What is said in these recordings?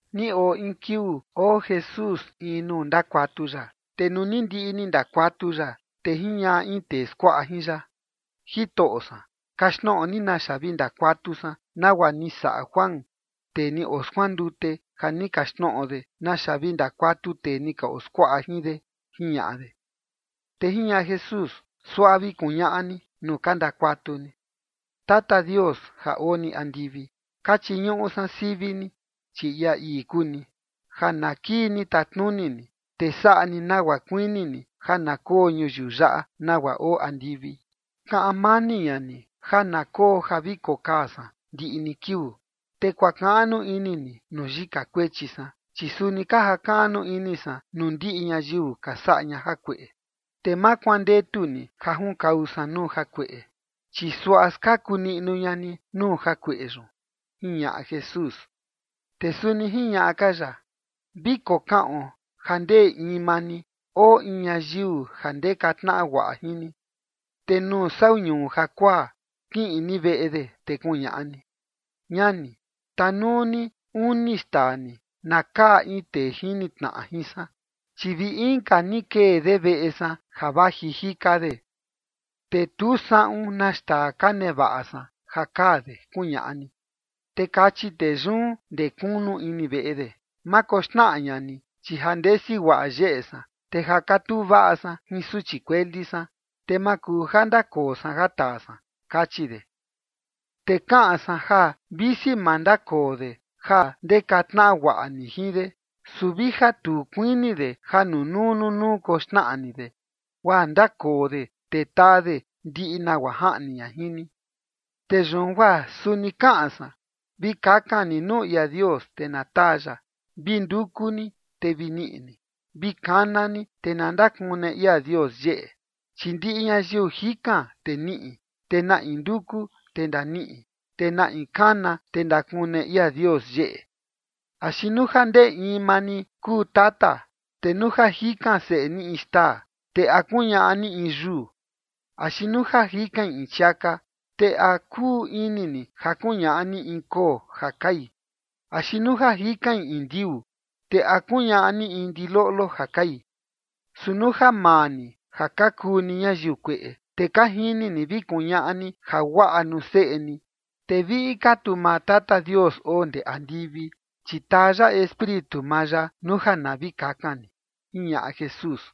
Ni oo in kiuu oo Jesús in nuu ndakuatu ya. Te nuu ni ndiꞌi ni ndakuatu ya, te jiñaꞌa in tee skuaꞌa jin ya: ―Jitoꞌo san, kaxtnoꞌo ni naxa vi ndakuatu san nagua ni saꞌa Juan, tee ni oskuandute, ja ni kaxtnoꞌo de naxa vi ndakuatu tee ni ka oskuaꞌa jin de ―jiñaꞌa de. Te jiñaꞌa Jesús: ―Suaꞌa vi kuñaꞌa ni nuu ka ndakuatu ni: Tata Dios, ja oo ni andivi, ka chiñuꞌu san sivi ni, chi ia ii kuu ni, ja na kii ni tatnuni ni. Te saꞌa ni nagua kuini ni ja na koo ñuyiu yaꞌa, nagua oo andivi. Kaꞌan mani ña ni ja na koo ja vi kokaa san ndiꞌi ni kiuu. Te kuakaꞌnu ini ni nuu yika kuechi san, chi suni ka jakaꞌnu ini san nuu ndiꞌi ñayiu ka saꞌa ña jakueꞌe. Te ma kuandetu ni ja junkau san nuu jakueꞌe, chi suaꞌa skaku niꞌnu ña ni nuu jakueꞌe yun ―jiñaꞌa Jesús. Te suni jiñaꞌa ka ya: ―Vi kokaꞌon ja ndee in maa ni oo in ñayiu ja ndeka tnaꞌa guaꞌa jin ni. Te nuu sau ñuu jakuaa, kiꞌin ni veꞌe de, te kuñaꞌa ni: “Ñani, tanuu ni uni xtaa ni, na kaa in tee jini tnaꞌa jin san, chi vi inka ni kee de veꞌe san ja vaji jika de, te tu saꞌun na xtaa ka nevaꞌa san ja kaa de”, kuñaꞌa ni. Te kachi tee yun ndee kunu ini veꞌe de: “Ma koxnaꞌa ña ni, chi ja ndesi guaꞌa yeꞌe san, te ja katuu vaꞌa san jin suchi kueli san, te ma kuu ja ndakoo san ja taa san”, kachi de. Te kaꞌan san ja visi ma ndakoo de ja ndeka tnaꞌa guaꞌa ni jin de, su vija tu kuini de ja nunuu nunuu koxnaꞌa ni de, guaa ndakoo de te taa de ndiꞌi nagua jaꞌni ña jin ni. Te yun guaa suni kaꞌan san: Vi kakan ni nuu ia Dios, te na taa ya. Vi nduku ni, te vi niꞌi ni. Vi kana ni, te na ndakune ia Dios yeꞌe. Chi ndiꞌi ñayiu jikan, te niꞌi. Te na in nduku, te ndaniꞌi. Te na in kana, te ndakune ia Dios yeꞌe. ’Axi nuu ja ndee in maa ni kuu tata, te nuu ja jikan seꞌe ni in xtaa, ¿te a kuñaꞌa ni in yuu? Axi nuu ja jikain in chiaka, te ¿a kuu ini ni ja kuñaꞌa ni in koo ja kai? Axi nuu jikain in ndiuu, te ¿a kuñaꞌa ni in ndiloꞌlo ja kai? Su nuu ja maa ni ja ka kuu ni ñayiu kueꞌe, te ka jini ni vi kuñaꞌa ni jaguaꞌa nuu seꞌe ni, te viꞌi ka tu maa Tata Dios oo ndee andivi, chi taa ya Espíritu maa ya nuu ja na vi kakan ni ―jiñaꞌa Jesús.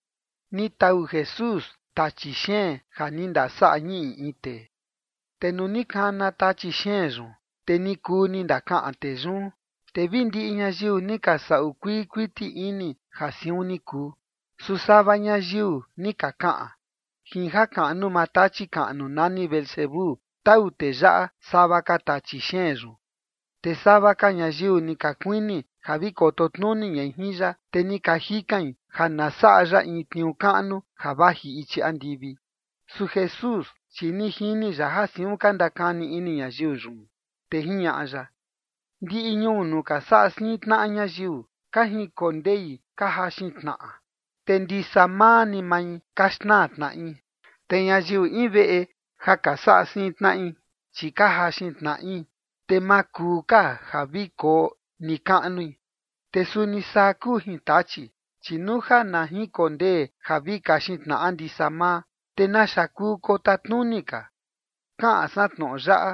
Ni tau Jesús tachi xeen ja ni ndasaꞌa ñiꞌi in tee. Te nuu ni kana tachi xeen yun, te ni kuu ni ndakaꞌan tee yun, te vi ndiꞌi ñayiu ni ka saꞌu kuii kuiti ini ja siun ni kuu. Su sava ñayiu ni ka kaꞌan: ―Jin jakaꞌnu maa tachi kaꞌnu nani Beelzebú tau tee yaꞌa sava ka tachi xeen yun. Te sava ka ñayiu ni ka kuini ja vi koto tnuni ña jin ya, te ni ka jikain ja na saꞌa ya in tniuu kaꞌnu ja vaji ichi andivi. Su Jesús, chi ni jini ya ja siun ka ndakani ini ñayiu yun, te jiñaꞌa ya: ―Ndiꞌi ñuu nuu ka saꞌa siin tnaꞌa ñayiu, ka jinkondei ka jaxin tnaꞌa, te ndisa maa ni mai ka xnaa tnaꞌi. Te ñayiu in veꞌe ja ka saꞌa siin tnaꞌi, chi ka jaxin tnaꞌi, te ma kuu ka ja vi koo nikaꞌnui. Te suni saa kuu jin Tachi, chi nuu ja na jinkondee ja vi kaxin tnaꞌa ndisa maa, ¿te naxa kuu kotatnuni ka? Kaꞌan san tnoꞌo yaꞌa,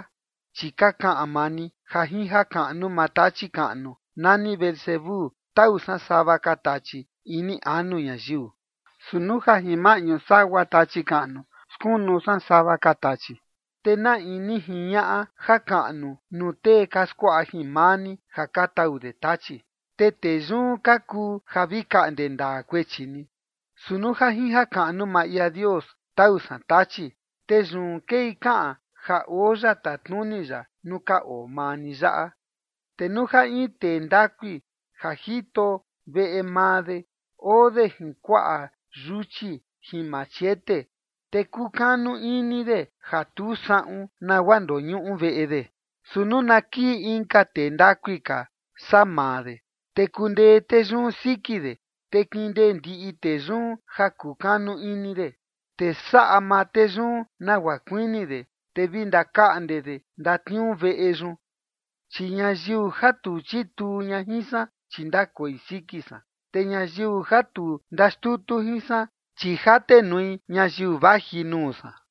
chi ka kaꞌan maa ni ja jin jakaꞌnu maa tachi kaꞌnu nani Beelzebú, tau san sava ka tachi ini anu ñayiu. Su nuu ja jin maꞌñu sagua tachi kaꞌnu skunu san sava ka tachi, te ¿na in ni jiñaꞌa jakaꞌnu nuu tee ka skuaꞌa jin maa ni, ja ka tau de tachi? Te tee yun ka kuu ja vi kaꞌnde ndaa kuechi ni. Su nuu ja jin jakaꞌnu maa ia Dios, tau san Tachi, te yun kei kaꞌan ja oo ya tatnuni ya nuu ka oo maa ni yaꞌa. ’Te nuu ja in tee ndakui ja jito veꞌe maa de oo de jin kuaꞌa yuchi jin machete, te kukanu ini de ja tu saꞌun nagua ndoñuꞌu veꞌe de. Su nuu na kii inka tee ndakui ka saa maa de, te kundee tee yun siki de, te kindee ndiꞌi tee yun ja kukanu ini de, te saꞌa maa tee yun nagua kuini de, te vi ndakaꞌnde de ndatniuu veꞌe yun. ’Chi ñayiu ja tu chituu ña jin san, chi ndakoi siki san. Te ñayiu ja tu ka ndaxtutu jin san, chi jatenui ñayiu vaji nuu san.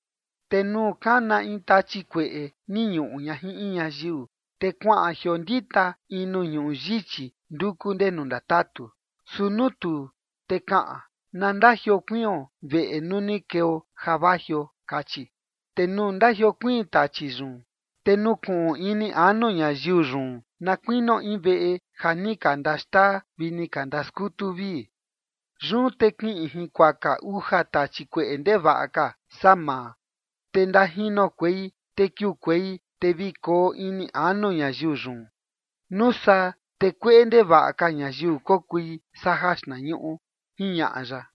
’Te nuu kana in tachi kueꞌe ni ñuꞌu ña jin in ñayiu, te kuaꞌan jiondita in nuu ñuꞌu yichi nduku ndenu ndatatu. Su nuu tuu, te kaꞌan: “Na ndajiokuion veꞌe nuu ni keo ja vajio”, kachi. Te nuu ndajiokuiin tachi yun, te nukuꞌun ini anu ñayiu yun na kuinio in veꞌe ja ni ka ndaxtaa vi ni ka ndaskutu vii. Yun te kiꞌin jinkuaka uja tachi kueꞌe ndevaꞌa ka saa maa, te ndajinokuei te kiukuei te vi koo ini anu ñayiu yun. Nuu saa, te kueꞌe ndevaꞌa ka ñayiu kokui saa jaxtnañuꞌu ―jiñaꞌa ya.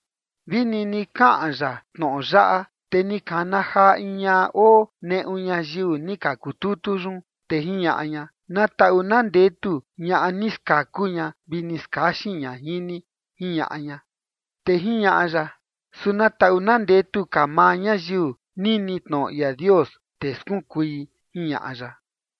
Vi nini kaꞌan ya tnoꞌo yaꞌa, te ni kana jaa in ñaꞌa oo neꞌu ñayiu ni ka kututu yun, te jiñaꞌa ña: ―Na taꞌu na ndetu ñaꞌa ni skaku ña vi ni skaxin ña jin ni ―jiñaꞌa ña. Te jiñaꞌa ya: ―Su na taꞌu na ndetu ka maa ñayiu nini tnoꞌo ia Dios, te skunkui ―jiñaꞌa ya.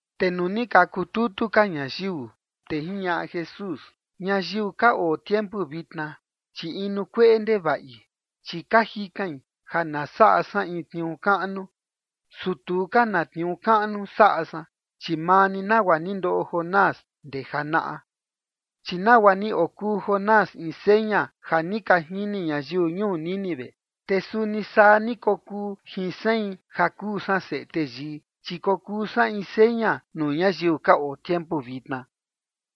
Te nuu ni ka kututu ka ñayiu, te jiñaꞌa Jesús: ―Ñayiu ka oo tiempu vitna, chi inu kueꞌe ndevaꞌi, chi ka jikain ja na saꞌa san in tniuu kaꞌnu, su tu ka na tniuu kaꞌnu saꞌa san, chi maa ni nagua ni ndoꞌo Jonás ndee janaꞌa. Chi nagua ni okuu Jonás in seña ja ni ka jini ñayiu ñuu Nínive, te suni saa ni kokuu jin sein, ja kuu san Seꞌe Teyii, chi kokuu san in seña nuu ñayiu ka oo tiempu vitna.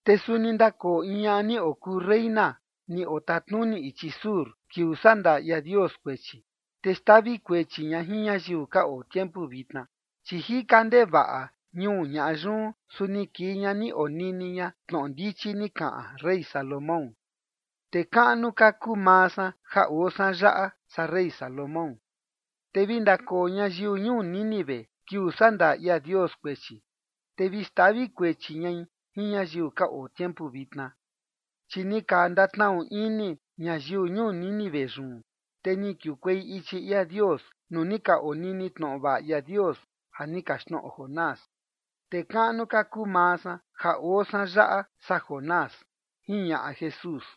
Te suni ndakoo in ñaꞌa ni okuu reyna ni otatnuni ichi sur, kiuu sandaa ia Dios kuechi, te xtavi kuechi ña jin ñayiu ka oo tiempu vitna, chi jika ndevaꞌa ñuu ñaꞌa yun, su ni kii ña ni onini ña tnoꞌo ndichi ni kaꞌan rey Salomón. Te kaꞌnu ka kuu maa san ja oo san yaꞌa, saa rey Salomón. Te vi ndakoo ñayiu ñuu Nínive kiuu sandaa ia Dios kuechi, te vi xtavi kuechi ñai jin ñayiu ka oo tiempu vitna. Chi ni ka ndatnaꞌu ini ñayiu ñuu Nínive yun, te ni kiukuei ichi ia Dios nuu ni ka onini tnoꞌo vaꞌa ia Dios ja ni kaxtnoꞌo Jonás. Te kaꞌnu ka kuu maa san ja oo san yaꞌa, saa Jonás ―jiñaꞌa Jesús.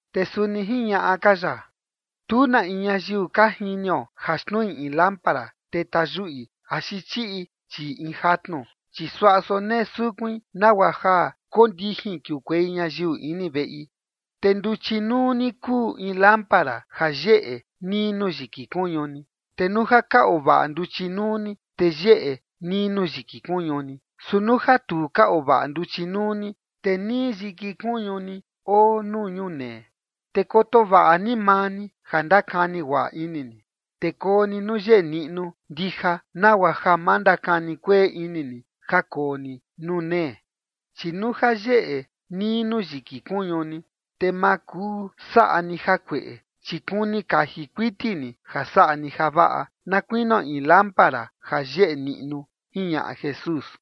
Te suni jiñaꞌa ka ya: ―Tu na in ñayiu ka jinio ja xtnui in lámpara, te tayuꞌi axi chiꞌi chii in jatnu, chi suaꞌa sonee sukuin nagua ja kondijin kiukuei ñayiu ini veꞌi. Te nduchi nuu ni kuu in lámpara ja yeꞌe nii nuu yiki kuñu ni. Te nuu ja ka oo vaꞌa nduchi nuu ni, te yeꞌe nii nuu yiki kuñu ni. Su nuu ja tu ka oo vaꞌa nduchi nuu ni, te nii yiki kuñu ni oo nuu ñunee. Te koto vaꞌa ni maa ni ja ndakani guaꞌa ini ni, te koo ni nuu yeꞌe niꞌnu ndija, nagua ja ma ndakani kueꞌe ini ni ja koo ni nuu nee. Chi nuu ja yeꞌe nii nuu yiki kuñu ni, te ma kuu saꞌa ni jakueꞌe, chi kuni kaji kuiti ni ja saꞌa ni javaꞌa, na kuinio in lámpara ja yeꞌe niꞌnu ―jiñaꞌa Jesús.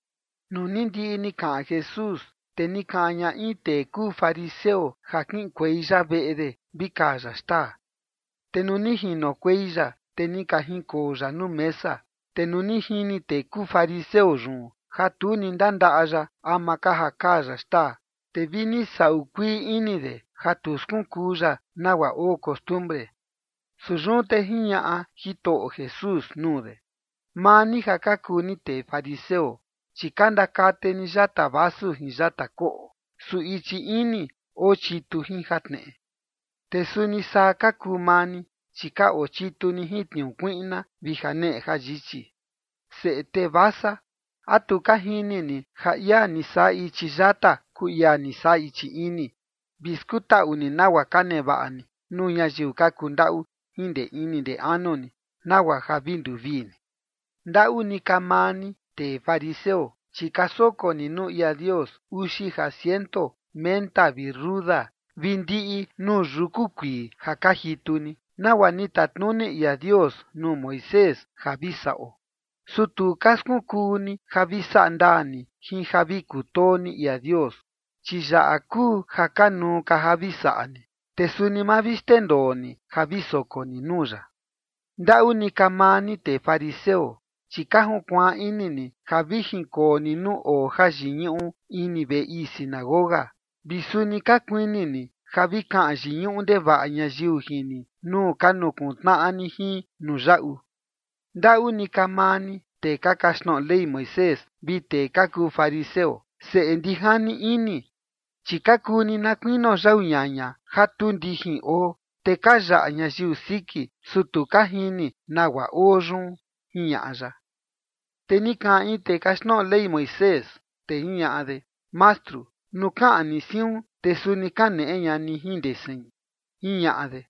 Nuu ni ndiꞌi ni kaꞌan Jesús, te ni kaꞌan ña in tee kuu fariseo ja kiꞌinkuei ya veꞌe de, vi kaa ya xtaa. Te nuu ni jinokuei ya, te ni ka jinkoo ya nuu mesa. Te nuu ni jini tee kuu fariseo yun ja tu ni ndandaꞌa ya ama ka ja kaa ya xtaa, te vi ni saꞌu kuii ini de ja tu skunkuu ya nagua oo costumbre. Su yun te jiñaꞌa Jitoꞌo Jesús nuu de: ―Maa ni ja ka kuu ni tee fariseo, chi ka ndakate ni yata vasu jin yata koꞌo, su ichi ini oo chitu jin jatneꞌe. Te suni saa ka kuu maa ni, chi ka oo chitu ni jin tniuu kuiꞌna vi janeꞌe jayichi. ¡Seꞌe tee vasa! ¿A tu ka jini ni ja ia ni saꞌa ichi yata kuu ia ni saꞌa ichi ini? Vi skutaꞌu ni nagua ka nevaꞌa ni nuu ñayiu ka kundaꞌu jin ndee ini ndee anu ni, nagua ja vi nduvii ni. ’¡Ndaꞌu ni ka maa ni, tee fariseo! Chi ka soko ni nuu ia Dios uxi ja ciento menta vi ruda vi ndiꞌi nuu yuku kuii ja ka jitu ni, nagua ni tatnuni ia Dios nuu Moisés ja vi saꞌo. Su tu ka skunkuu ni ja vi saꞌa ndaa ni jin ja vi kutoo ni ia Dios. Chi yaꞌa kuu ja kanuu ka ja vi saꞌa ni, te suni ma vi xndendoo ni ja vi soko ni nuu ya. ’¡Ndaꞌu ni ka maa ni, tee fariseo! Chi ka junkuaan ini ni ja vi jinkoo ni nuu oo jayiñuꞌu ini veꞌe ii sinagoga, vi suni ka kuini ni ja vi kaꞌan yiñuꞌu ndevaꞌa ñayiu jin ni nuu ka nukuntnaꞌa ni jin nuu yaꞌu. ¡Ndaꞌu ni ka maa ni, tee ka kaxtnoꞌo Ley Moisés vi tee ka kuu fariseo, seꞌe ndijani ini! Chi ka kuu ni na kuinio yau ñaña ja tu ndijin oo, te ka yaꞌa ñayiu siki, su tu ka jini nagua oo yun ―jiñaꞌa ya. Te ni kaꞌan in tee kaxtnoꞌo Ley Moisés, te jiñaꞌa de: ―Mastru, nuu kaꞌan ni siun, te suni kaneꞌe ña ni jin ndee sein ―jiñaꞌa de.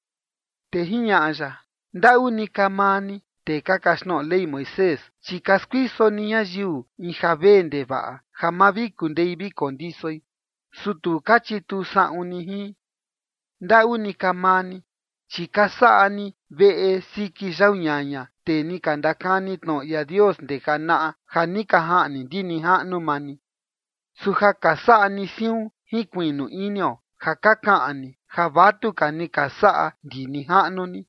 Te jiñaꞌa ya: ―¡Ndaꞌu ni ka maa ni, tee ka kaxtnoꞌo Ley Moisés! Chi ka skuiso ni ñayiu in ja vee ndevaꞌa ja ma vi kundei vi kondisoi. Su tu ka chituu saꞌun ni jin. ¡Ndaꞌu ni ka maa ni! Chi ka saꞌa ni veꞌe siki yau ñaña tee ni ka ndakani tnoꞌo ia Dios ndee janaꞌa, ja ni ka jaꞌni ndi nijaꞌnu maa ni. Su ja ka saꞌa ni siun jinkuiꞌnu inio ja ka kaꞌan ni ja vatuka ni ka saꞌa ndi nijaꞌnu ni,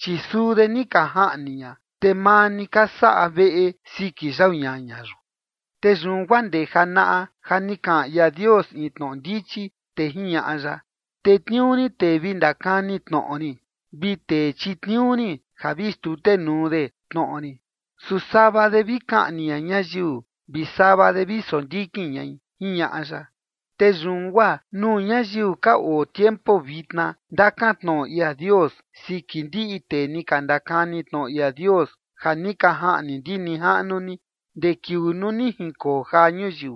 chi suu de ni ka jaꞌni ña, te maa ni ka saꞌa veꞌe siki yau ñaña yun. ’Te yun guaa ndee janaꞌa ja ni kaꞌan ia Dios in tnoꞌo ndichi, te jiñaꞌa ya: “Tetniuu rin tee vi ndakani tnoꞌo rin vi tee chitniuu rin ja vi xtutenuu de tnoꞌo rin, su sava de vi kaꞌni ña ñayiu vi sava de vi sondikin ñai”, jiñaꞌa ya. Te yun guaa nuu ñayiu ka oo tiempu vitna ndakan tnoꞌo ia Dios siki ndiꞌi tee ni ka ndakani tnoꞌo ia Dios ja ni ka jaꞌni ndi nijaꞌnu ni ndee kiuu nuu ni jinkoo jaa ñuyiu.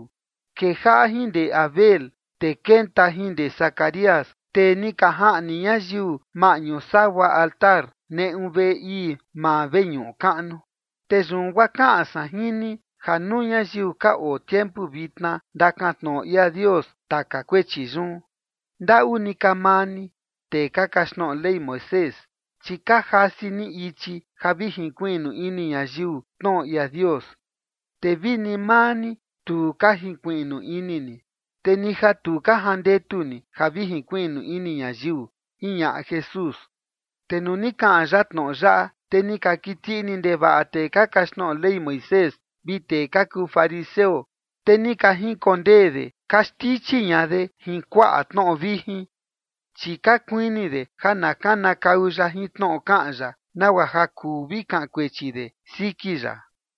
Kejaꞌa jin ndee Abel, te kenta jin ndee Zacarías, tee ni ka jaꞌni ñayiu maꞌñu sagua altar neꞌu veꞌe ii maa veñuꞌu kaꞌnu. Te yun guaa kaꞌan san jin ni ja nuu ñayiu ka oo tiempu vitna ndakan tnoꞌo ia Dios taka kuechi yun. ’¡Ndaꞌu ni ka maa ni, tee ka kaxtnoꞌo Ley Moisés! Chi ka jasi ni ichi ja vi jinkuiꞌnu ini ñayiu tnoꞌo ia Dios, te vini maa ni tu ka jinkuiꞌnu ini ni, te ni ja tu ka jandetu ni ja vi jinkuiꞌnu ini ñayiu ―jiñaꞌa Jesús. Te nuu ni kaꞌan ya tnoꞌo yaꞌa, te ni ka kiti ini ndevaꞌa tee ka kaxtnoꞌo Ley Moisés vi tee ka kuu fariseo, te ni ka jinkondee de ka xtichi ña de jin kuaꞌa tnoꞌo vijin. Chi ka kuini de ja na kanakau ya jin tnoꞌo kaꞌan ya, nagua ja kuu vi kaꞌan kuechi de siki ya.